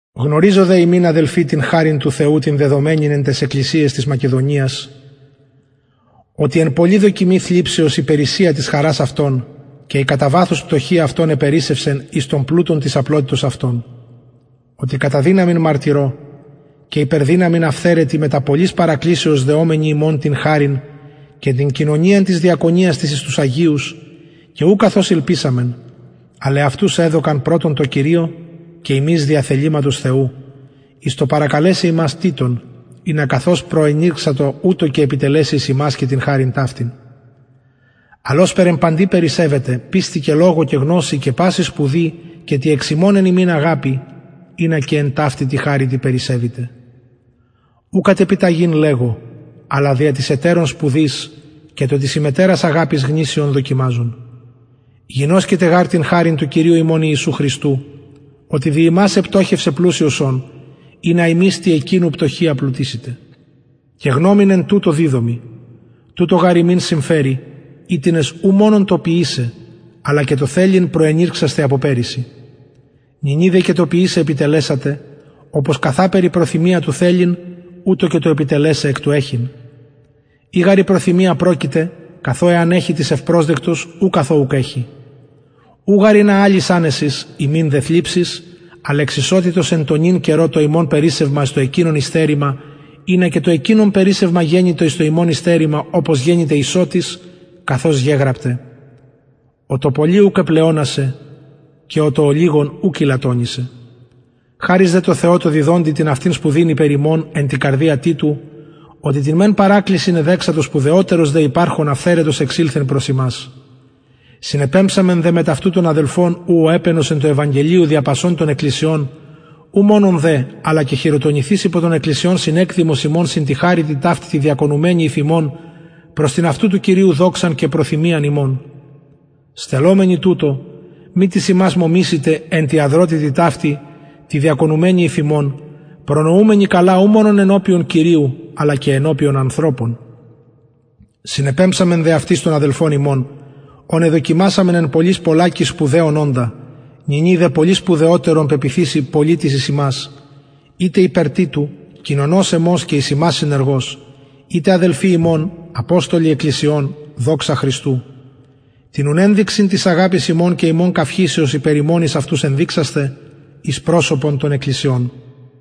γνωριζομεν δε υμιν αδελφοι την χαριν του θεου την δεδομενην εν ταις εκκλησιαις της μακεδονιας οτι εν πολλη δοκιμη θλιψεως η περισσεια της χαρας αυτων και η κατα βαθους πτωχεια αυτων επερισσευσεν εις τον πλουτον της απλοτητος αυτων οτι κατα δυναμιν μαρτυρω και υπερ δυναμιν αυθαιρετοι μετα πολλης παρακλησεως δεομενοι ημων την χαριν και την κοινωνιαν της διακονιας της εις τους αγιους και ου καθως ηλπισαμεν αλλ εαυτους εδωκαν πρωτον τω κυριω και ημιν δια θεληματος θεου εις το παρακαλεσαι ημας τιτον ινα καθως προενηρξατο ουτως και επιτελεση εις υμας και την χαριν ταυτην αλλ ωσπερ εν παντι περισσευετε πιστει και λογω και γνωσει και παση σπουδη και τη εξ υμων εν ημιν αγαπη ινα και εν ταυτη τη χαριτι περισσευητε ου κατ επιταγην λεγω αλλα δια της ετερων σπουδης και το της υμετερας αγαπης γνησιον δοκιμαζων γινωσκετε γαρ την χαριν του κυριου ημων ιησου χριστου οτι δι υμας επτωχευσεν πλουσιος ων ινα υμεις τη εκεινου πτωχεια πλουτησητε και γνωμην εν τουτω διδωμι τουτο γαρ υμιν συμφερει οιτινες ου μονον το ποιησαι αλλα και το θελειν προενηρξασθε απο περυσι νυνι δε και το ποιησαι επιτελεσατε οπως καθαπερ η προθυμια του θελειν ουτως και το επιτελεσαι εκ του εχειν ει γαρ η προθυμια προκειται καθο εαν εχη τις ευπροσδεκτος ου καθο ουκ εχει ου γαρ ινα αλλοις ανεσις υμιν δε θλιψις αλλ εξ ισοτητος εν τω νυν καιρω το υμων περισσευμα εις το εκεινων υστερημα ινα και το εκεινων περισσευμα γενηται εις το υμων υστερημα οπως γενηται ισοτης καθως γεγραπται ο το πολυ ουκ επλεονασεν και ο το ολιγον ουκ ηλαττονησεν χαρις δε τω θεω τω διδοντι την αυτην σπουδην υπερ υμων εν τη καρδια τιτου οτι την μεν παρακλησιν εδεξατο σπουδαιοτερος δε υπαρχων αυθαιρετος εξηλθεν προς υμας συνεπεμψαμεν δε μετ αυτου τον αδελφον ου ο επαινος εν τω ευαγγελιω δια πασων των εκκλησιων ου μονον δε αλλα και χειροτονηθεις υπο των εκκλησιων συνεκδημος ημων συν τη χαριτι ταυτη τη διακονουμενη υφ ημων προς την αυτου του κυριου δοξαν και προθυμιαν ημων στελλομενοι τουτο μη τις ημας μωμησηται εν τη αδροτητι ταυτη τη διακονουμενη υφ ημων προνοουμενοι καλα ου μονον ενωπιον κυριου αλλα και ενωπιον ανθρωπων συνεπεμψαμεν δε αυτοις τον αδελφον ημων ον εδοκιμασαμεν εν πολλοις πολλακις σπουδαιον οντα νυνι δε πολυ σπουδαιοτερον πεποιθησει πολλη τη εις υμας ειτε υπερ τιτου κοινωνος εμος και εις υμας συνεργος ειτε αδελφοι ημων αποστολοι εκκλησιων δοξα χριστου την ουν ενδειξιν της αγαπης υμων και ημων καυχησεως υπερ υμων εις αυτους ενδειξασθε εις προσωπον των εκκλησιων